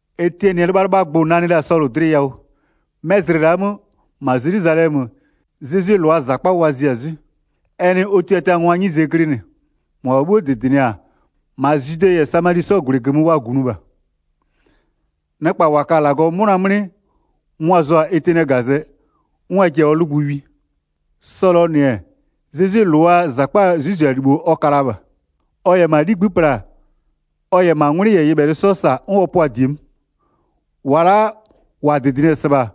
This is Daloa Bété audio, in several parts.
Etiɛnɩɛ 'lɩbhalɩbhagbʋ nanɩ la Sɔlʋ dlɩ yawʋ. 'Mɛ zlɩ la'a 'mö, -ma Zelwizalɛmö, Zezwie -lʋaa -zakpa wa zia-a 'zwɩ. Ɛ nɩ ɔ tiatiangwaa 'nyize glɩnɩ, -mʋabha 'bhuo -dɩdɩnɩ-a, -ma Zwide -yɛ Samali 'sɔɔ -gwlɩ -gömö wa -gunʋ -bha. Nɩkpa -wa ka-a -Lagɔɔ 'mʋna 'mlɩ, mʋa-a zʋ-a Etiɛnɩɛ -gazɛ 'n wa ji-a ɔ 'lʋgbʋ wi. Sɔlʋɔ -nɩ-ɛ, Zezwie -lʋaa -zakpaa 'zwɩzialibho ɔ ka la -bha. Ɔ -yɛ -ma 'ligbï'ï pla, ɔ -yɛ -ma 'ngwlɩ -yɛ nyɩbhɛlɩ 'sɔ -sa 'n ɔ pʋa-a -die 'mö. 4-Wa la'a -wa -dɩdɩnɩ-ɛ -sɩbha,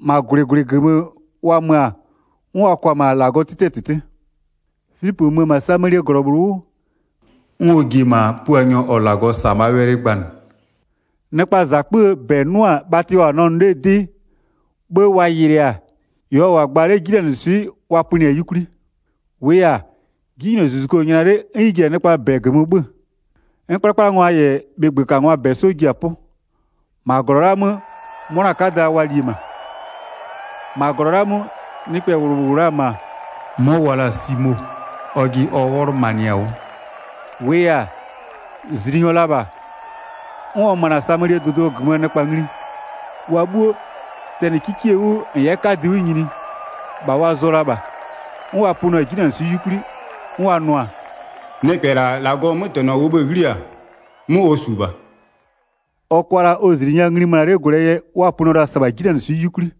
-ma -gwlɩ -gwlɩ -gömö wa mö-a, 'n wa kwa-a -ma -Lagɔɔ 'tɩtɩɛ -tɩtɩ. Filipö mö-ö -ma Samalie -glɔ -bhlʋ 'wʋ, 'n ɔ ji-e -ma Puanyɔ -ɔ -Lagɔ -sa-a -bhaa wɛlɩ gbanɩ. Nɩkpaa -zakpöö -bɛ 'nʋ-a -bhatɩ ɔ -wʋ-a nɛ nʋ 'lee 'dɩ, 'bhë wa yɩlɩɩ-a, -ɩ ɔ -wʋ-a gba 'le 'jinanɩswɩ'ɩ wa pönɩɩ-a 'yukwli. 7-Wʋʋ yɛ-a, 'jinylozuzuku-o nyla 'le 'n ɩ ji-a nɩkpaa -bɛ -gömö 'bhö-ö, 'n 'kplakplangwa -yɛ bhɩgbökangwaa -bɛ 'sɔ ji-a 'pʋ. 8-Ma -glɔ la'a 'mö 'mʋna 'kada wa li-e -ma. -Zliinyɔ -bhlʋ yɛ Zezwie bhatɩ yɩlɩ 9-Ma -glɔ la'a 'mö, nɩkpɛ -bhlʋ -wʋ la-a -ma, 'mɔ wa la-a Simo. Ɔjɩ ɔ 'wɔlʋmanɩ-a 'wʋ. -Wʋʋ yɛ-a, -zliinyɔ la -bha, 'n ɔ möna-a Samalie dʋdʋ -gömöö nɩkpa ngli. Wa 'bhuo, tɛnɩ 'kikie 'wʋ -n 'yɛ 'kadɩ 'wʋ nyini, -bha wa zʋɔ la -bha, 'n wa pönɩɔ-a 'jinanɩswɩ'ɩ 'yukwli, 'n wa nʋ-a: “Nɩkpɛ -la, -Lagɔɔ 'mötɛnɔ -ʋʋ bhë-ë 'ghli-a, 'mʋ ɔ -su -bha.” Ɔ kʋa la ɔ -zli nya ngli möna 'le gwlɛɛ yɛ wa pönɩɔ la-a -sɩbha 'jinanɩswɩ'ɩ 'yukwli.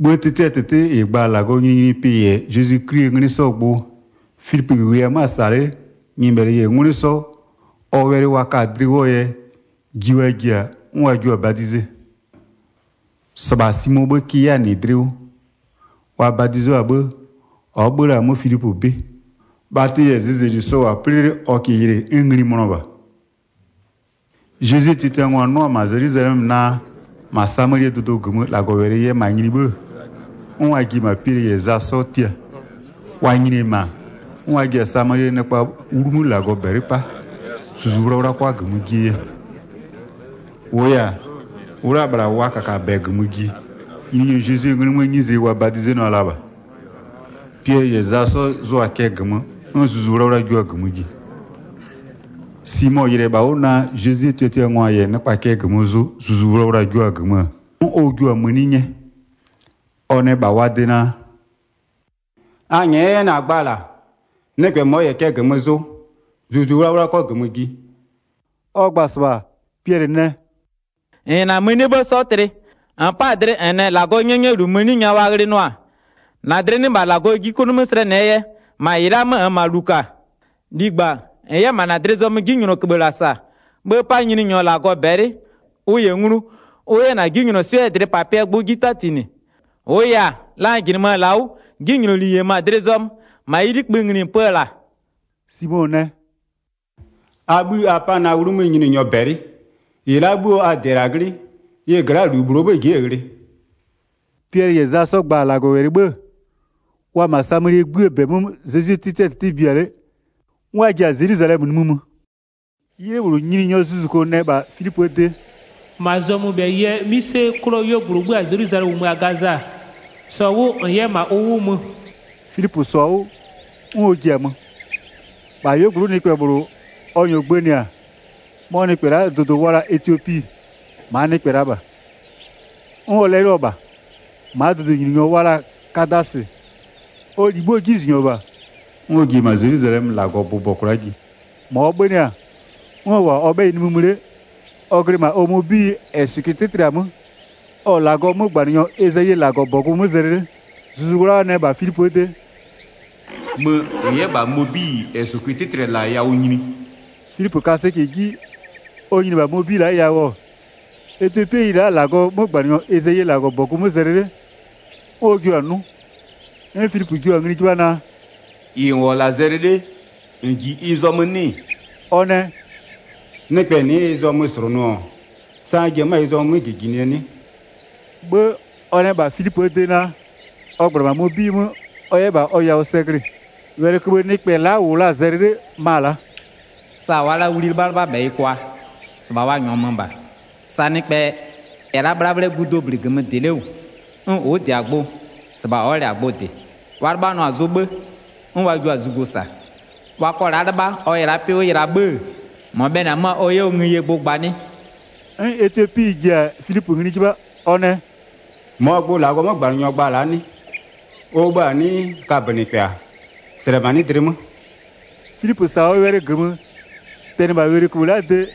'Bhë 'tɩtɩɛ -tɩtɩ -ɩ gba-a -Lagɔɔ nyininyinipɩ -yɛ Zezwi 'Klie 'nglɩ 'sɔɔ gbʋ, Filipö -wʋɩ-ɛ 'mö-a -sa 'le-e, nyɩbhɛlɩ -yɛ 'ngwlɩ 'sɔ, ɔ wɛlɩ wa ka-a dlɩ 'wʋɔ yɛ, ji wa ji-a 'n wa jua-a badize. 13-Sɩbha Simoo 'bhë kɩ 'yɛ-a -nɩ dlɩ 'wʋ. Wa badizo-a 'bhë, ɔ'ɔ 'bhö-ö la-a 'mö Filipö 'bɩ. Bhatɩ -yɛ zɩzɛli sɔ-ɔ -wʋ-a 'plɩ 'le ɔ -kɩɩ yɩlɩ 'n ngli mönɔ -bha. Zezwie tiatiangwa 'nʋ-ɔ -ma Zelwizalɛmö naa, -ma Samalie dʋdʋ -gömö -Lagɔwɛlɩ yɛ -ma nyini 'bhë-ë, 'n wa ji-e -ma Piɛlɩ -yɛ Za 'sɔ tia. Wa nyini-e -ma, 'n wa ji-a Samalie nɩkpaa 'wlumö -Lagɔ -bɛlɩ 'pa, Zuzu 'Wlawla 'kʋa -gömö jie yɛ. 16-Wʋʋ yɛ-a, ʋ'ʋ la -bhla wa -kakabɛ -gömö ji, Nyininyɔ Zezwie 'nglɩ 'möö 'nyize wa badizenʋa la -bha. Piɛlɩ -yɛ Za 'sɔ zʋa-a cɛ -gömö, 'n Zuzu 'Wlawla jua-a -gömö ji. Simo yɩlɩ-ɛ -bha 'wʋ naa Zezwie tiatiangwa -yɛ nɩkpa cɛ -gömö zʋ Zuzu Wlawla-a jua-a -gömö-ö, 'n ɔ jua-a mëni 'nyɛ. Ɔ nɛ -bha wa de naa: “A nyɛ'ɛ 'yɛ na-a gba -la, nɩkpɛ -mɔ n -yɛ cɛ -gömö zʋ, Zuzu 'Wlawla 'kɔ -gömö ji.” Ɔ gba-a -sɩbha, Piɛlɩ nɛ: “-N -yɛ -na mënie 'bhë 'sɔ tlɩ. -N 'pa-a dlɩ -n nɛ -Lagɔɔ 'nyɛnyɛlu mëni nya wa ghlɩnʋ-a? 21-Na dlɩ 'nɩ -bha -Lagɔ 'ji 'klʋ 'mö slɛnɩɛ yɛ, -ma -ɩ la'aa 'mö -nn -ma -lu -ka. Ligba, -n 'yɛ -ma -na dlɩ zɔmöö 'jinylɔköbhë -la -sa, 'bhë 'pa Nyininyɔ -Lagɔ -bɛlɩ, ʋ -yɛ nglu, ʋ 'yɛ -na 'jinylɔswɩ'ɩɛ dlɩpapɩɛɛ gbʋ 'ji 'tatinɩ. 23-Wʋʋ yɛ-a, la n -jɩnɩmö-ö -la 'wʋ 'jinyloli -yemö-a dlɩ zɔmö, -ma ɩ 'likpï ngli -n pö-ö -la.” Simo nɛ: “A 'bhï a 'pa na 'wlumö Nyininyɔ -bɛlɩ, -ɩ la'a 'bhuo a -dɩ-ɛ -la 'nglɩ, ɩ gla'aa -lu -bhlʋ ji'i-e ghlɩ.” Piɛlɩ -yɛ Za 'sɔ gba-a -Lagɔwɛlɩ 'bhë-ë, wa-a -ma Samalie 'gbïë -bɛ 'mö Zezwie 'tɩtɩɛ -tɩtɩ bia 'le, 'n wa ji-a Zelwizalɛmö nimï mö. 'Ylɩ -bhlʋ, Nyininyɔɔ zuzuko nɛ -bha Filipöö de: “-Ma zɔmöbhɛyɩ 'mïse 'klʋɔ 'yuogblʋ -ʋ 'bhö-a Zelwizalɛmö -ʋ mö-a Gaza, -sɔ 'wʋ -n 'yɛ -ma ʋ 'wʋ mö.” Filipö -sɔ-a 'wʋ, 'n ɔ ji-a mö. -Bha 'yuogblʋ'ʋ nɩkpɛ -bhlʋ ɔ -nyɔɔ gbënɩ-a, 'mɔ nɩkpɛ la'a dʋdʋ wa la-a Etiopi, -maa nɩkpɛ la -bha. 'N ɔ 'lɛlɩɔ-ɔ -bha. -Maa dʋdʋnyininglɔ wa la-a Kadasɩ, ɔ -li 'bhuoo 'jizʋnyɔ -bha, 'n ɔ ji-e -ma Zelwizalɛmö -Lagɔ -bʋbɔ kwla'a ji. 28-Ma ɔ 'bhönɩ-a, 'n ɔ -wʋ-a ɔ 'bhɛyɩ nimï mö 'le, ɔ glɩ -ma ɔ mobiyi -ɛ -sʋkʋɩ 'tɩtlɩ-a 'mö, ɔ-ɔ -Lagɔɔ 'mögbanɩnyɔ Ezayie -Lagɔbɔgʋ mö zɛlɩ 'le. Zuzu 'Wlawla nɛ -bha Filipöö de: “Mö -n 'yɛ -bha mobiyi -ɛ -sʋkʋɩ 'tɩtlɩ-ɛ -laa yawʋ nyini.” Filipö ka sɛcɛ 'ji, ɔ nyini-e -bha mobiyi la'aa yawʋ, etiopiyi la'a-a -Lagɔɔ 'mögbanɩnyɔ Ezayie -Lagɔbɔgʋ 'mö zɛlɩ 'le, 'n ɔ jiɩ-a 'nʋ. 'N Filipö jio-a ngli 'jɩbha naa: “-Ɩ -n -wʋ-ɔ -la zɛlɩ 'le, -n -ji ɩ zɔmö 'nɩ-ɩ?” Ɔ nɛ: “Nɩkpɛ nɩ'ɩ ɩ zɔmö -slʋnʋ-ɔ, sa n ji-e 'mö-a ɩ zɔmö 'mö -jijinɩɛ 'nɩ?” 'Bhë ɔ nɛ -bha Filipöö de naa, ɔ -gbla -ma mobiyi 'mö ɔ 'yɛ -bha ɔ yawʋ sɛ glɩ-ɩ. Wɛlɩköbhë nɩkpɛ la'a -wʋ la-a zɛlɩ 'le, ma-a la'a: “Sa wa'a la'a wli 'lɩbhalɩbhabhɛyɩ kwa, -sɩbha wa -nyɔɔ mö -bha. Sa nɩkpɛ -yɛ la'a 'bhlabhlɛgu dobli -gömö -dɩ 'le -wʋ, 'n ʋ'ʋ -dɩ-a gbʋ-ɔ, -sɩbha ɔ'ɔ -lɛ-a gbʋ -dɩ. Wa 'lɩbhanɩɔ-a zʋ 'bhë, 'n wa jio-a zugo -sa. Wa kɔ la'a 'lɩbha, ɔ yɛ la'a 'pɩ 'wʋ yɩla 'bhë-ë, -mɔ bhɛlɩ-ɛ 'mö-a ɔ 'yɛ ɔ ngëyie gbʋ gba 'nɩ?” 'N etiopiyi la'a ji-a Filipö ngli 'jɩbha, ɔ nɛ: “-Mɔɔ gbʋ -Lagɔɔ 'mögbanɩnyɔ gba-a la'a 'nɩ? Ɔ bhë-a 'nɩɩ, kabönɩkpɛ-a? -Slɛmanɩ'ɩ dlɩ 'mö.” Filipö -sa-a ɔ wɛlɩ -gömö, tɛnɩ -bha wɛlɩköbhë la'aa de,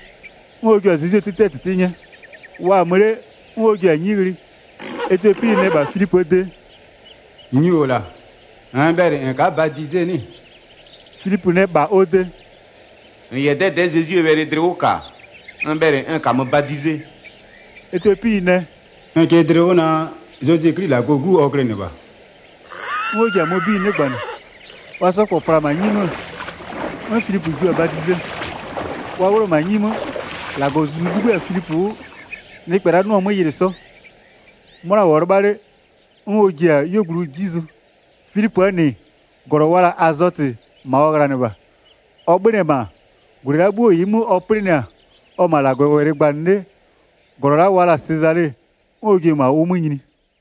'n ɔ jio-a Zezwie 'tɩtɩɛ -tɩtɩ 'nyɛ. Wa-a mö 'le, 'n wa ji-a 'nyi ghlɩ. Etiopiyi nɛ -bha Filipöö de: “Nyu-o -la, -nn bhɛlɩ -n ka'a badize 'nɩ-ɩ?” Filipö nɛ -bha ɔ de: “-N -yɛ 'dɛdɛ'ɛ Zezwie wɛlɩ dlɩ 'wʋ -ka, n bhɛlɩ n -kamö badize.” Etiopiyi nɛ: “N kɩ dlɩ 'wʋ naa, Zezwi 'Kli -Lagɔɔ 'Gu ɔ glɩnɩ -bha.” 'N ɔ ji-a mobiyi 'nɩgbanɩ. Wa 'sɔ -kpɔ pla-a -ma 'nyi 'mö, 'n Filipö jio-a badize. Wa 'wlʋ-ɔ -ma 'nyi 'mö, -Lagɔɔ Zuzu 'libhï-a Filipö 'wʋ, nɩkpɛ la'a 'nɩɔ-a 'mö yɩlɩ 'sɔ. 'Mʋna -wʋɔ 'lɩbha 'le, 'n ɔ ji-a ɔ 'yuogblʋ 'ji zʋ. Filipöö -nɩ, -glɔ wa la-a Azɔtɩ, -ma ɔ ghlanɩ -bha. Ɔ 'bhönɩ-ɛ -ma, -gwlɩ la'a 'bhuo -ɩɩ 'mö ɔ 'plɩnɩ-a, ɔ-ɔ -ma -Lagɔwɛlɩ gbanɩ 'le, -glɔ wa la-a Sezale, 'n ɔ ji-e -ma ʋ 'wʋ nyini.